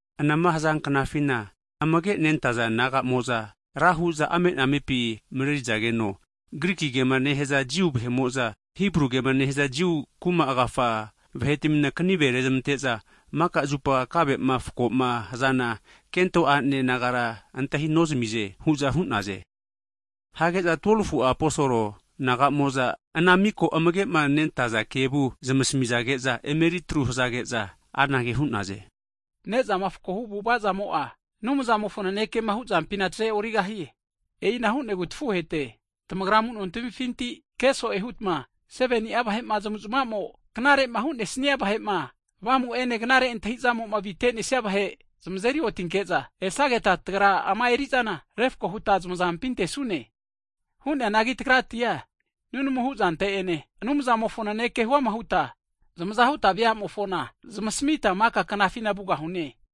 Anama haza knafina, amage nentaza disaipol nagamo'za ra hu'za ame'nanempi mareri'zageno, Griki kema nehaza Jiu vahe'mo'za, Hibru kema nehaza Jiu kuma agafa vahetmina kanive rezamante'za, mika zupa kave'ma fakoma hazana kento a'ne nagara antahi nozamize hu'za hu'naze. Hage'za 12fu'a aposol nagamo'za ana mika amage'ma nentaza disaipol kevu zamasmizage'za emeritru hazage'za anage hu'naze. Ne'zama fakohu avu'avazamo'a, Anumzamofo nanekema hu'zampina tazeorigahie. E'ina hu'negu tafuhete, tamagra amu'no tamifinti keso'e hutma 7ni'a vahema zamu'zmamo knare'ma hu'nesnia vahe'ma, Avamu'ene knare antahi'zamo'ma avitenesia vahe zamazeri otinke'za, esageta tagra ama erizana refako huta zamazampi antesune. Hu'neanagi tagratia nunamu hu'zante'ene, Anumzamofo naneke'a huama huta veamofona zamasmita maka knafina vugahune.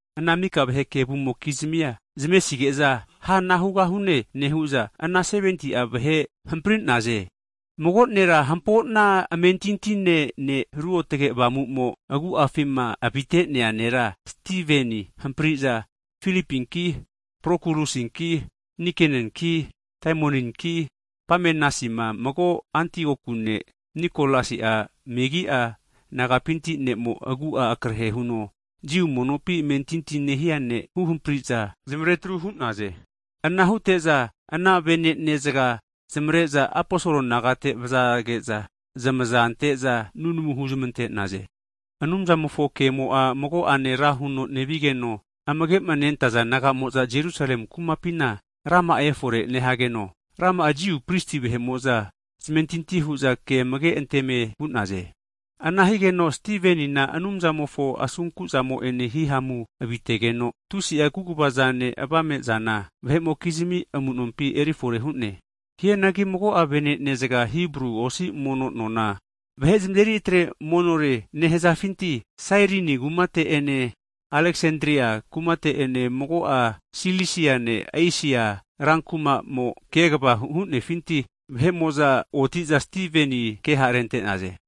Ana mika vahe kevumokizmia zamesige'za, ana hugahune nehu'za, ana 70ti'a vahe hampri'naze, mago ne'ma hampona amentintine ne' Ruotge Avamu'mo agu'afima avite'nea nera Stiveni huhampriza Filipinki Prokulusinki Nikenanki Taimoninki Pamenasima, mago Antioku ne' Nikolasi'a megi'a nagapinti ne'mo agu'a akrehe huno Jiu monopi amentinti nehia ne' huhampri'za zamaretru hu'naze. Ana hute'za ana vene'ne zga zamare'za aposol nagate vazage'za zamaza ante'za, nunamu huzmante'naze. Anumzamofo kemo'a mago'ane ra huno nevigeno, amagema nentaza disaipol nagamo'za Jerusalemi kumapina rama'a efore nehageno, ra'ma'a Jiu prisi vahe'mo'za zamentinti hu'za ke amage'anteme vu'naze. Ana higeno, Stivenina Anumzamofo asunkuzamo'ene hihamumo avite'negeno, tusi'a kaguva zane, avame'zanena vahe'mokizmi amunompi erifore hu'ne. Hianagi mago'a vene'nezga, Hibru osi mono nona (Sinagog) vahe zamazeri atre monore nehazafinti Sairini kumate'ene Aleksandria kumate'ene, mago'a Silisiane, Esia rankuma'mo kegva hu'nefinti (provins) vahe'mo'za oti'za Stiveni keha rente'naze.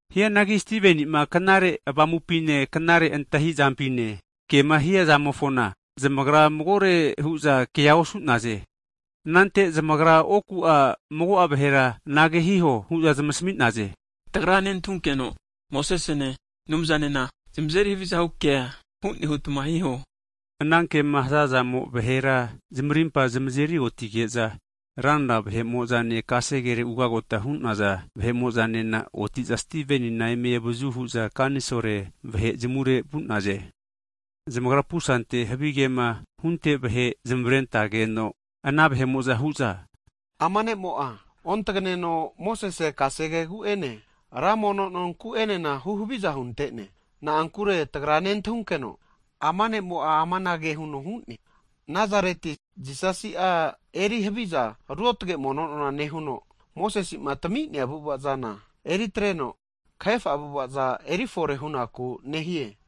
Hianagi Stiveni'ma knare Avamupine, knare antahizampine kema hiazamofona, zamagra magore hu'za kea osu'naze. Anante zamagra oku'a mago'a vahera anage hiho hu'za zamasmi'naze; Tagra nentahunkeno Mosesene, Anumzanena zanazeri havizahu kea hu'ne hutma hiho hu'naze. Ana kema hazazamo vahera zamarimpa zamazeri otigeza, ranra vahe'mo'zane kasere ugagota hunaza vahe'mo'zanena oti'za Stivenina eme avazu hu'za kanisol (Senhitren) vahe zamure vu'naze. Zamagra pusante havigema hunte vahe zamaretageno, ana vahe'mo'za hu'za ama ne'mo'a, ontagneno Mosese kasegegu'ene, ra mono nonku enena huhaviza hunte'ne hu'za hu'naze. Na'ankure tagra nentahunkeno ama nemo'a amanage huno hu'ne, Nazareti Jisasi'a eri haviza ruotge mono nona nehuno, Mosesi'ma tami'nea avu'ava'zana, eriatreno kahefa avu'ava eri fore hunaku nehie.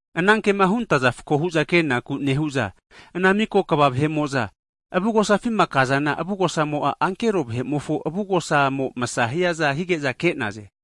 Anankema huntaza fakohu'za kenaku nehu'za ana mika kva vahe'mo'za avugosafima kazana, avugosamo'a ankero vahe'mofo avugosamo msa hiaza hige'za ke'naze.